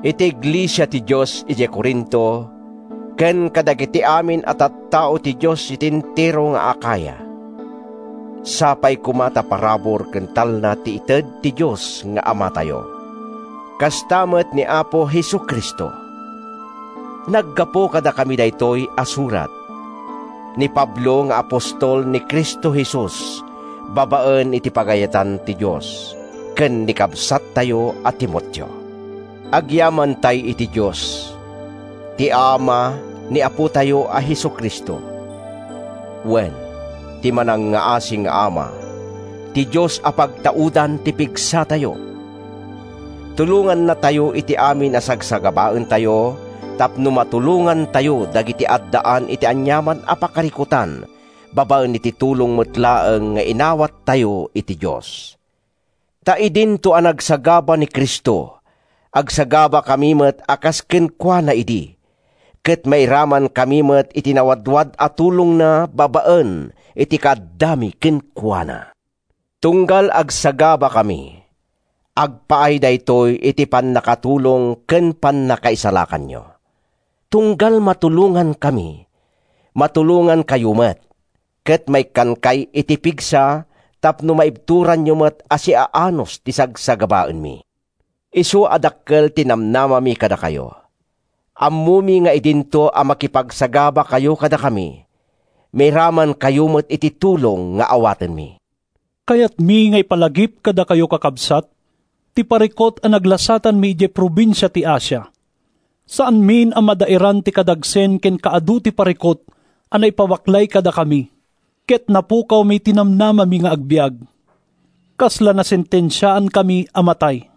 Iti iglesia ti Dios idiay Corinto ken kadagiti amin a tattao ti Dios iti entero nga Acaya: Sapay koma ta parabur ken talna ti ited ti Dios nga Amatayo, kasta met ni Apo Jesu-Cristo. Naggapu kadakami daytoy a surat—ni Pablo nga apostol ni Cristo Jesus babaen iti pagayatan ti Dios, ken ni kabsattayo a Timoteo. Agyamantay iti Dios, ti Ama ni Apotayo a Jesu-Cristo; wen, ti manangngaasi nga Ama, ti Dios a pagtaudan ti pigsatayo! Tulongannatayo iti amin a sagsagabaentayo tapno matulongantayo dagiti addaan iti aniaman a pakarikutan babaen iti tulong met laeng nga inawattayo iti Dios. Ta idinto a nagsagaba ni Cristo, agsagabakami met a kas kenkuana idi ket mairamankami met iti nawadwad a tulongna babaen iti kaaddami kenkuana. Tunggal agsagabakami, agpaay daytoy iti pannakatulong ken pannakaisalakanyo. Tunggal matulongankami, matulongankayo met, ket maikkankay iti pigsa tapno maibturanyo met a siaanus ti sagsagabaenmi. Isu a dakkel ti namnamami kadakayo. Ammomi nga idinto a makipagsagabakayo kadakami, mairamankayo met iti tulong nga awatenmi. Kayatmi nga ipalagip kadakayo, kakabsat, ti parikut a naglasatanmi idiay probinsia ti Asia. Saanmin a madaeran ti kadagsen ken kaadu ti parikut a naipabaklay kadakami, ket napukawmi ti namnamami nga agbiag. Kasla nasentensiaankami a matay.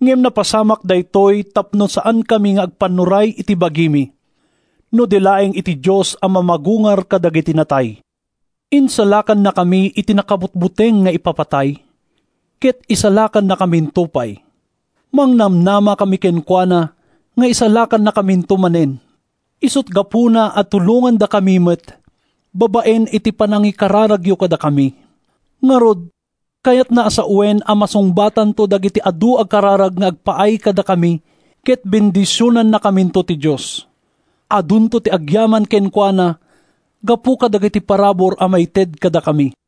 Ngem napasamak daytoy tapno saankami nga agpannuray iti bagimi, no di laeng iti Dios a mamagungar kadagiti natay. Insalakannakami iti nakabutbuteng nga ipapatay, ket isalakannakaminto pay. Mangnamnamakami kenkuana nga isalakannakaminto manen. Isut’ gapuna a tulongandakami met babaen iti panangikararagyo kadakami. Ngarud, kayatna a sawen a masungbatanto dagiti adu a kararag nga agpaay kadakami ket bendisionannakaminto ti Dios. Adunto ti agyaman kenkuana gapu kadagiti parabur a maited kadakami.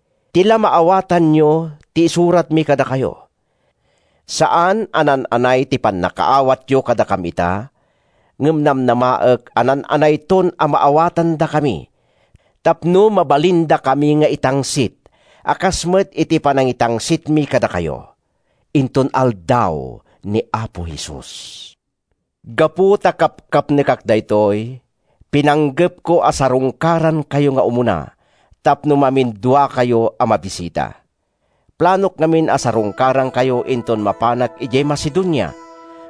Ti la maawatanyo ti isuratmi kadakayo. Saan a naan-anay ti pannakaawatyo kadakam ita, ngem namnamaek a naan-anayton a maawatandakami tapno mabalindakami nga itangsit a kas met iti panangitangsitmi kadakayo, inton Aldaw ni Apo Jesus. Gapu ta kapkapnekak daytoy, pinanggepko a sarungkarankayo nga umuna tapno maminduakayo a mabisita. Planok ngamin a sarungkarankayo inton mapanak idiay Macedonia,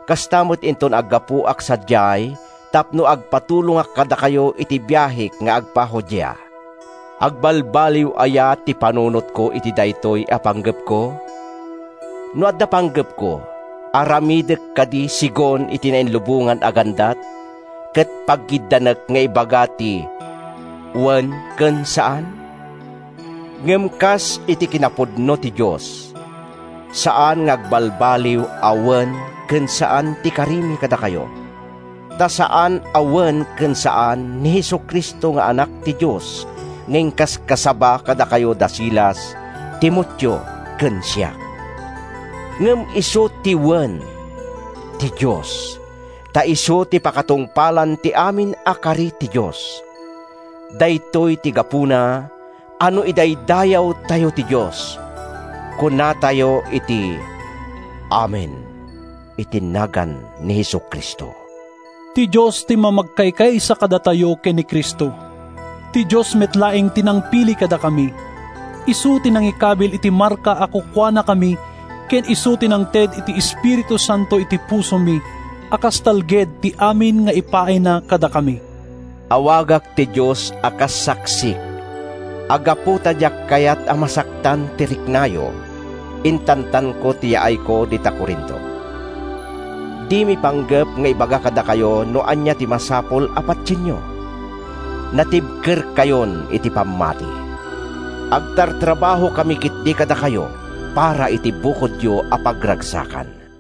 kasta met inton aggapuak sadiay tapno agpatulongak kadakayo iti biahek nga agpa-Judea. Agbaliwbaliw aya ti panunotko iti daytoy a panggepko? No adda panggepko, aramidek kadi segun ti nainlubongan a gandat, ket paggiddanek nga ibaga ti “Wen” ken “Saan”? Ngem kas iti kinapudno ti Dios, saan nga agbalbaliw a “Wen” ken “Saan” ti karimi kadakayo. Ta saan a “Wen” ken “Saan” ni Jesu-Cristo nga Anak ti Dios nga inkaskasaba kadakayo da Silas, Timoteo ken siak. Ngem isu ti “Wen” ti Dios, ta isu ti pakatungpalan ti amin a kari ti Dios. Daytoy ti gapuna a no idaydayawtayo ti Dios, kunatayo iti “Amen” iti nagan ni Jesu-Cristo. Ti Dios ti mamagkaykaysa kadatayo ken ni Cristo. Ti Dios met laeng ti nangpili kadakami. Isu ti nangikabil iti marka a kukuanakami ken isu ti nangted iti Espiritu Santo iti pusomi a kas talged ti amin nga ipaayna kadakami. Awagak ti Dios a kas saksik a gapu ta diak kayat a masaktan ti riknayo, intantanko ti yaayko dita Corinto. Dimi panggep nga ibaga kadakayo no ania ti masapul a patienyo; natibkerkayon iti pammati. Agtartrabahokami ketdi kadakayo para iti bukodyo a pagragsakan.